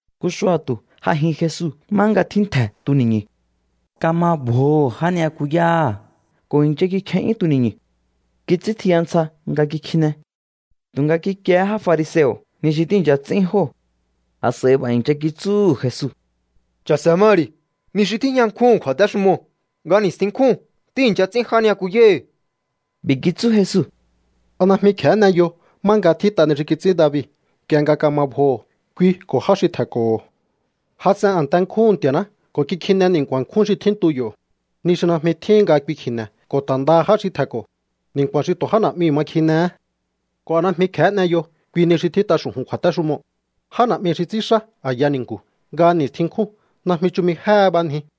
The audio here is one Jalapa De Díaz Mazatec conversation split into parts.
Nku xua̱tu̱ j'ajin Jesu má nga tjíntje̱ tuni̱ñu̱. Kama bjoho̱ já ni'yakuyáha̱ ko̱ i̱ncha kikje'yún tuni̱ñu̱. Kits'íntjiya ntsja nga kikjine. Tu̱nga kikiehé já fariseo̱ ni xi tíi̱ncha ts'ín jóo̱. A̱s'a̱i b'a̱ i̱ncha kitsúhu̱ Jesu: —Cha̱se̱ ma ri̱. Ni xi tíjña nkjúhu̱n kju̱a̱téxumoo̱ nga ni̱stjin nkjúu̱n tíi̱ncha ts'ín já ni'yakuyáhi̱. B'i̱ kitsú Jesu: —¿A najmi kje̱hé n'eyo má nga tjít'a ni xi kits'ín David nk'ie nga kama bjoho̱ kui ko̱ já xi tje̱nko̱ho̱? Jas'en a̱nte nkjúhu̱n Nti̱a̱ná ko̱ kikjine ni̱nku̱a̱n nkjún xi tjíntu yo̱, ni xi najmi tjíhin nga kui kji̱ne̱ ko̱ ta̱ ndaha já xi tje̱nko̱, ni̱nku̱a̱n xi tu̱ já na̱'miu̱ ma kjinehé. ¿Ko̱ a najmi kje̱hé n'eyo kui nii̱ xi tjít'a xu̱ju̱n kju̱a̱téxumoo̱? Já na̱'mi xi ts'ínxá a̱ya ni̱nku̱ nga ni̱stjin nkjúu̱n najmi chumi jéhe b'anji.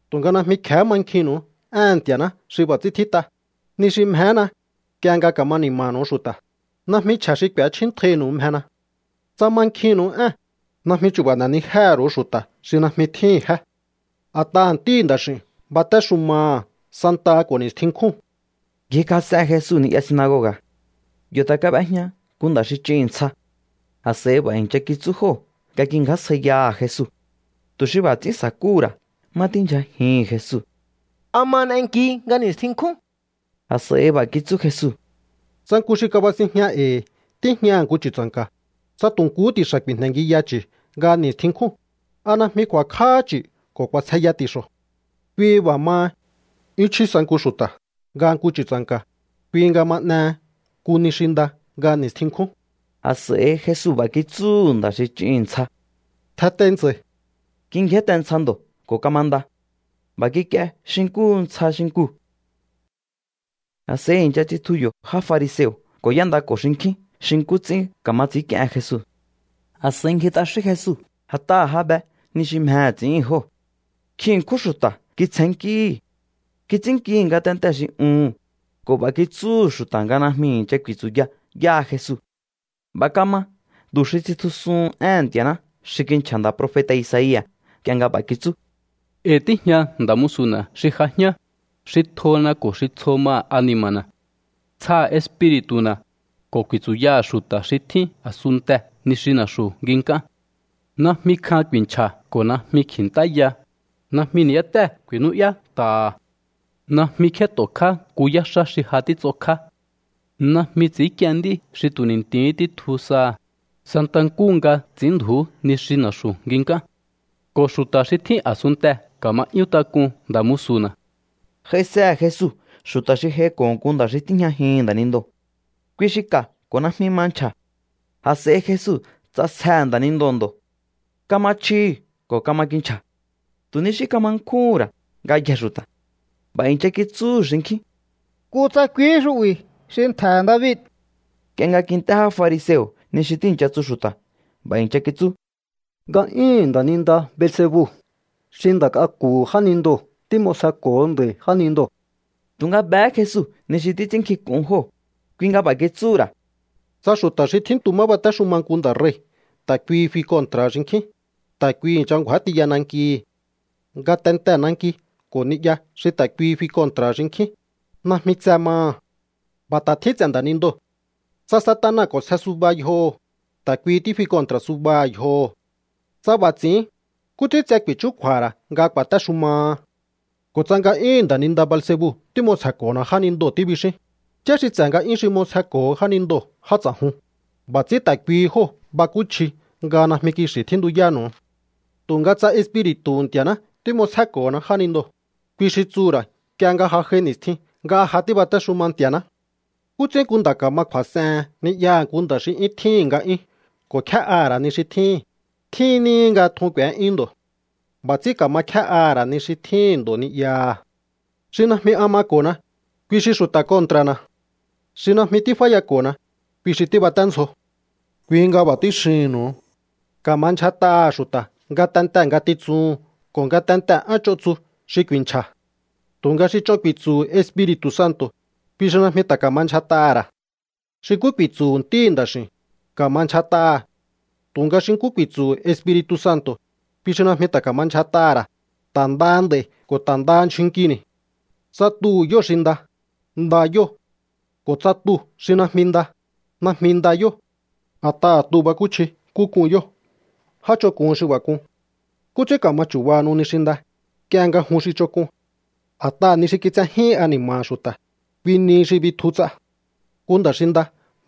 ’Tu̱nga najmi kje̱hé mankjinnu̱u éhe̱n Nti̱a̱ná xi b'a̱ ts'ín tjít'a: “Ni xi mjehéna, nk'ie nga ka̱ma ni̱ma̱nu̱u xu̱ta̱. Najmi chje̱ xi k'u̱échjíntjainu̱u mjena.” Tsa mankjinnu̱u ée̱n, najmi chu̱ba̱ n'e̱nijéhe̱ ru̱u xu̱ta̱ xi najmi tjíhi̱n jé. A̱t'aha̱ Ntíhi̱ Nda̱x'i̱u̱n batéxumaha̱ santaha ko̱ ni̱stjin nkjúu̱n. Ngjikjas'en Jesu ni'ya sinagoga̱. Yo̱ ta̱ kab'ejña nku nda̱ xi ch'ihi̱n ntsja. A̱s'a̱i b'a̱ i̱ncha kitsú jóo̱ nga kingjásjaiyaha̱ Jesu, tu̱ xi b'a̱ ts'ín sa̱kúhu̱ ra̱ má tíndyjajihi̱n Jesu: —¿A ma n'enki nga ni̱stjin nkjún? A̱s'a̱i b'a̱ kitsú Jesu: —Tsa nku xi kabasinjña e̱i̱ tíjñaha̱ nku chu̱tsa̱nka̱, tsa tu̱ nkuhú ti̱xa̱ ku̱i̱jne̱ngiya chu̱ nga ni̱stjin nkjúu̱n, ¿a najmi ku̱a̱kj'áhá chu̱ ko̱ k'u̱a̱sjeya ti̱xo̱? Kui b'a̱ maha, ¡'yún chjí sa nku xu̱ta̱ nga nku chu̱tsa̱nka̱! Kui nga ma n'ehe nku ni xi nda nga ni̱stjin nkjún. A̱s'a̱i Jesu b'a̱ kitsúhu̱ nda̱ xi ch'ihi̱n ntsja: —Tjentei ntsa̱i̱. Kingjénte ntsja ndo̱ ko̱ kamanda. B'a̱ kik'ie xi nkúhu̱ ntsja xinkuu̱. A̱s'a̱i i̱ncha tsitju yo̱ já fariseo̱ ko̱ y'éndako̱ xinkjín xi nkú ts'ín ka̱ma ts'i̱ínk'iehen Jesu. A̱s'a̱i ngji t'axín Jesu, a̱t'aha̱ ja be ni xi mjehe̱ ts'i̱ín jóo̱. Nkjin ṉkjún xu̱ta̱ kitsjennkíhi̱. Kits'ínnkihi̱ ngatentee̱ xi uhu̱n ko̱ b'a̱ kitsúhu̱ xu̱ta̱ nga najmi i̱ncha ku̱i̱tsu̱ya yáha Jesu. B'a̱ kama tu̱ xi tsitjusuhun éhe̱n Nti̱a̱ná xi kinchja̱ nda̱ profeta̱ Isaia̱ nk'ie nga b'a̱ kitsú: E̱i̱ tíjña nda̱ musu̱na̱ xi j'ajián, xi tjona ko̱ xi tsjo maha̱ ani̱ma̱na̱. Tsjaha̱ Espiri̱tu̱na̱, ko̱ ku̱i̱tsu̱yaha̱ xu̱ta̱ xi tjín a̱sunntee̱ ni xi na̱xu̱ nginkán. Najmi kjan ku̱i̱nchja̱ ko̱ najmi kji̱ntáya, najmi ni̱yátée̱ ku̱i̱nú'yá nta̱ha̱. Najmi kjét'okjá nku yáxá xi ja títs'okjá. Najmi ts'i̱ínk'ien nd'í xi tu̱ ni̱nti̱hí títju saha̱, santa nkúhu nga ts'i̱ínndju̱ú ni xi na̱xu̱ nginkán. Ko̱ xu̱ta̱ xi tjín a̱sunntee̱ ka̱ma 'yún tak'un nda̱ musu̱na̱. J'aisehe̱ Jesu xu̱ta̱ xi j'aiko̱ nku nda̱ xi tíjñajihi̱n nda̱nindoo̱. Kui xi ka̱ ko̱ najmi ma nchja̱. A̱s'a̱i Jesu ts'asjehe̱ nda̱nindoo̱ ndo̱. Kama chjihi̱ ko̱ kama kinchja̱. Tu̱ ni xí kama nkjúhu̱n ra̱ ngayjee̱ xu̱ta̱. B'a̱ i̱ncha kitsúhu̱ xinkjín: —¿Kutsa kuihí xu'bi̱ xi ntje̱he̱ David? Nk'ie nga kint'é já fariseo̱ ni xi tíi̱ncha tsu xu̱ta̱, b'a̱ i̱ncha kitsú: —Nga'yúhu̱n nda̱ninda Beelzebu xi nda̱ k'aku̱hu̱ jánindoo̱ tím'osjeko̱ho nda̱i̱ jánindoo̱. Tu̱nga behé Jesu ni xi títs'ínnkjink'un jóo̱, kui nga b'a̱ kitsúhu̱ ra̱: —Tsa xu̱ta̱ xi tjíntu má batéxuma nku nda̱ rei̱ ta̱ kuihi fi kontra̱ha̱ xinkjín, ta̱ kuihi i̱ncha ngju̱á tiya nankihi̱. Ngatentee̱ nanki ko̱ ni'ya xi ta̱ kuihi fi kontra̱ha̱ xinkjín, najmi tse maha̱. B'a̱ ta̱ tjín ts'e̱ nda̱nindoo̱. Tsa Satana k'o̱nsje suba yjoho̱, ta̱ kuihi tífi kontra̱ subaha̱ yjoho̱. Tsa b'a̱ ts'i̱ín, ¿nkú ts'ín tse ku̱i̱chúkju̱a̱ha̱ ra̱ nga ku̱a̱téxumaha? ’Ko̱ tsa nga'yúhu̱n nda̱ninda Beelzebu tím'osjeko̱hona jánindoo̱ tíbixíún, ¿yá xi ts'e̱ nga'yún xi m'osjeko̱ho jánindoo̱ já ts'a̱jun? B'a̱ ts'ín ta̱ kuihi jóo̱ bakúchji nga najmi kixi̱ tjíntuyánu̱u. Tu̱nga tsa Espiri̱tu̱hu̱ Nti̱a̱ná tím'osjéko̱hona jánindoo̱, kui xi tsuhu̱ ra̱ nk'ie nga ja j'ai ni̱stjin nga ja tíbatéxuma Nti̱a̱ná. ’¿Nkú ts'ín nku nda̱ ka̱ma kju̱a̱s'ehen ni'yaha̱ nku nda̱ xi 'yún tjíhi̱n nga'yún ko̱ kjé'aha̱ ra̱ ni xi tjíhín? Tjín níhi nga tjun k'u̱é'yún ndo̱. B'a̱ ts'ín ka̱ma kjé'aha̱ ra̱ ni xi tjíhi̱n ndo̱ ni'yaha̱. Xi najmi an mako̱na, kui xi xu̱ta̱ kontra̱na̱. Xi najmi tíf'áyako̱na, kui xi tíbaténdzjo. ’Kui nga b'a̱ tíxihi̱nnu̱u. Ka̱ma ndyjat'aha̱ xu̱ta̱ ngatentee̱ ngatitsuhu̱n ko̱ ngatentee̱ én ch'on tsu xi ku̱i̱nchja̱. Tu̱nga xi ch'on ku̱i̱tsu̱hu̱ Espiri̱tu̱ Santo̱, kui xi najmi ta̱ ka̱ma ndyjat'aha̱ ra̱. Xi nkú ku̱i̱tsu̱hu̱ Ntíhi̱ Nda̱x'i̱u̱n, ka̱ma ndyjat'aha̱. Tu̱nga xi nkú ku̱i̱tsu̱hu̱ Espiri̱tu̱ Santo̱, kui xi najmi ta̱ ka̱ma ndyjat'aha̱ ra̱, ta̱ ndaha nd'a̱i̱ ko̱ ta̱ ndaha ndyjun nkini̱. ’Tsa tuhu̱ yóo̱ xi nda, nda yóo̱. Ko̱ tsa tuu̱ xi najmi nda, najmi nda yóo̱. A̱t'aha̱ tuu̱ bakúchji nkú k'un yóo̱. ¡Já ch'onk'un xi b'a̱ k'un! ¿Nkú ts'ín ka̱ma chu̱bahanu ni xi nda, nk'ie nga jun xi ch'onk'un? A̱t'aha̱ ni xi kitsejíhin ani̱ma̱ha̱ xu̱ta̱, kui nihi xi bitju ts'a. Nku nda̱ xi nda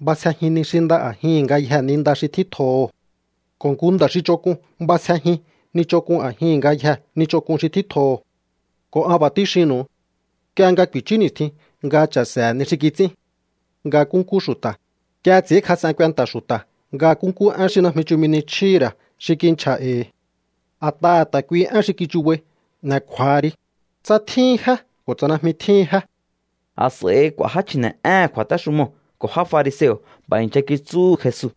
b'asjejin ni xi nda a̱jihi̱n ngayjee̱ ni nda xi tjítjoho̱. Ko̱ nku nda̱ xi ch'onk'un b'asjejin ni ch'onk'un a̱jihi̱n ngayjee̱ ni ch'onk'un xi tjítjoho̱. ’Ko̱ an b'a̱ tíxinnu̱u. Nk'ie nga ku̱i̱chú ni̱stjin nga cha̱se̱he̱ ni xi kits'ín nga nkúnkú xu̱ta̱, nk'ie ts'i̱ínkjas'en kuenta̱ xu̱ta̱ nga nkúnkú én xi najmi chumi ni chjíhi̱ ra̱ xi kinchja̱ e̱i̱. A̱t'aha̱ ta̱ kuihi én xi kichubai n'e̱ kju̱a̱ha ri, tsa tjíhin jé ko̱ tsa najmi tjíhin jé. A̱s'a̱i k'u̱a̱ já chji̱ne̱'éhe̱n kju̱a̱téxumoo̱ ko̱ já fariseo̱ b'a̱ i̱ncha kitsúhu̱ Jesu: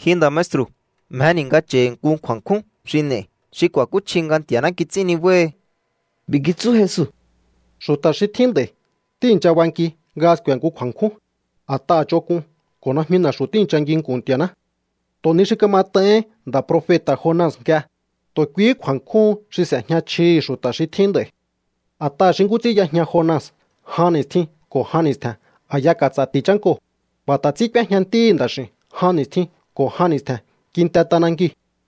—Ji nda̱ maestru̱, mjeni̱ nga cha̱i̱ nku kju̱a̱kjún xi n'e̱i̱, xi ku̱a̱kúchji nga Nti̱a̱ná kits'ín nibáhi. B'i̱ kitsú Jesu: —Xu̱ta̱ xi tjín nd'a̱i̱ tíi̱ncha banki nga sku̱e̱ nku kju̱a̱nkjún, a̱t'aha̱ ch'onk'un ko̱ najmi na̱xu̱ tíi̱ncha nginku̱n Nti̱a̱ná. Tu̱ ni xi kamat'aihín nda̱ profeta̱ Jona nk'ie, tu̱ kuihí kju̱a̱nkjún xi s'e̱jña chjihi̱ xu̱ta̱ xi tjín nd'a̱i̱. A̱t'aha̱ xi nkú ts'ín y'ejña Jona jan ni̱stjin ko̱ jan ni̱stje̱n a̱ya ka̱ts'a̱ ti̱ chánkoo̱, b'a̱ ta̱ ts'ín k'úéjña Ntíhi̱ Nda̱x'i̱u̱n jan ni̱stjin ko̱ jan ni̱stje̱n kinte t'anankiu̱.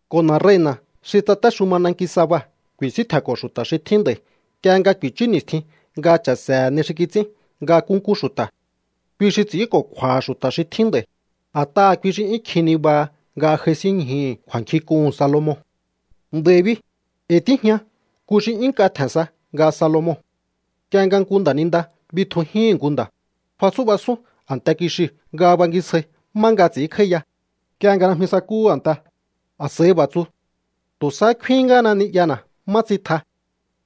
Ko̱ na̱ rei̱na̱ xi tsatéxuma nanki Saba ku̱i̱síntje̱nko̱ xu̱ta̱ xi tjín nd'a̱i̱ nk'ie nga ku̱i̱chú ni̱stjin nga cha̱se̱he̱ ni xi kits'ín nga nkúnkú xu̱ta̱. Kui xi ts'i̱ínko̱kju̱a̱ha̱ xu̱ta̱ xi tjín nd'a̱i̱, a̱t'aha̱ kui xi 'yún kjin nibaha nga j'aisínñjuhu̱ kju̱a̱nkjink'uhu̱n Salomon. Nd'a̱i̱ bi, e̱i̱ tíjña nku xi 'yún nk'a tje̱n sa nga Salomon. ’Nk'ie nga nku nda̱ninda bitjujíhi̱n nku nda̱, fatsú'basún a̱nte kixiu̱ nga bangisjai má nga ts'i̱ínkj'áíya. Nk'ie nga najmi sakúhu̱ a̱nte, a̱s'a̱i b'a̱ tsu: “Tu̱ sahá kfin ngáhana ni'yana̱ má tsitja.”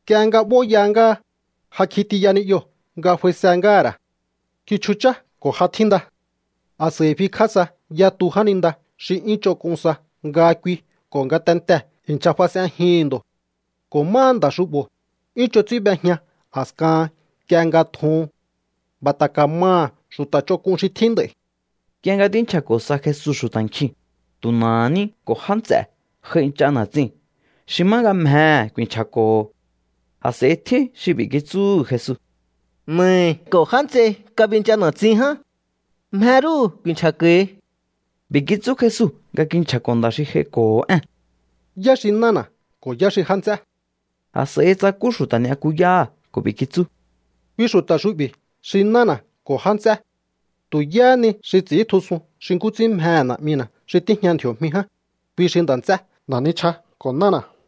Nk'ie nga b'óya ngáha, ja kjitiya ni'yoo̱ nga f'aise ngáha̱ ra̱. Kichjuchá ko̱ ja tjínda. A̱s'a̱i fikj'á sa yatu jáninda xi 'yún ch'onk'un sa nga kui ko̱ ngatentee̱ i̱ncha fas'enjihi̱n ndo̱. Ko̱ máha nda̱ xu'bo̱, 'yún ch'on ts'ín b'ejña a̱skahan nk'ie nga tjuhun. B'a̱ ta̱ ka̱maha̱ xu̱ta̱ ch'onk'un xi tjín nd'a̱i̱. Nk'ie nga tínchja̱ko̱ sa Jesu xu̱ta̱ nkjiu̱n, tu̱ na̱aha̱ ní ko̱ já nts'e̱ j'aincha na̱tsiu̱n xi má nga mjehe̱ ku̱i̱nchja̱ko̱ho̱. A̱s'a̱i tjín xi b'i̱ kitsúhu̱ Jesu: —Na̱ahi̱ ko̱ já nts'ei kabincha na̱tsin ján. Mje rúhu̱ ku̱i̱nchja̱ko̱hi. B'i̱ kitsú Jesu nga kinchja̱ko̱ nda̱ xi j'aiko̱ho̱ ée̱n: —¿Yá xi nána̱ ko̱ yá xi já nts'é? A̱s'a̱i tsakú xu̱ta̱ ni'yakuyáha̱ ko̱ b'i̱ kitsú: —Kui xu̱ta̱ xu'bi̱ xi nána̱ ko̱ já nts'é. Tu̱ yáhá ni xi ts'i̱íntjusun xi nkú ts'ín mjehe̱ Na̱'mina̱ xi tíjña ndji̱o̱jmi ján, kui xi nda̱ nts'é, na̱ nichja ko̱ nána̱.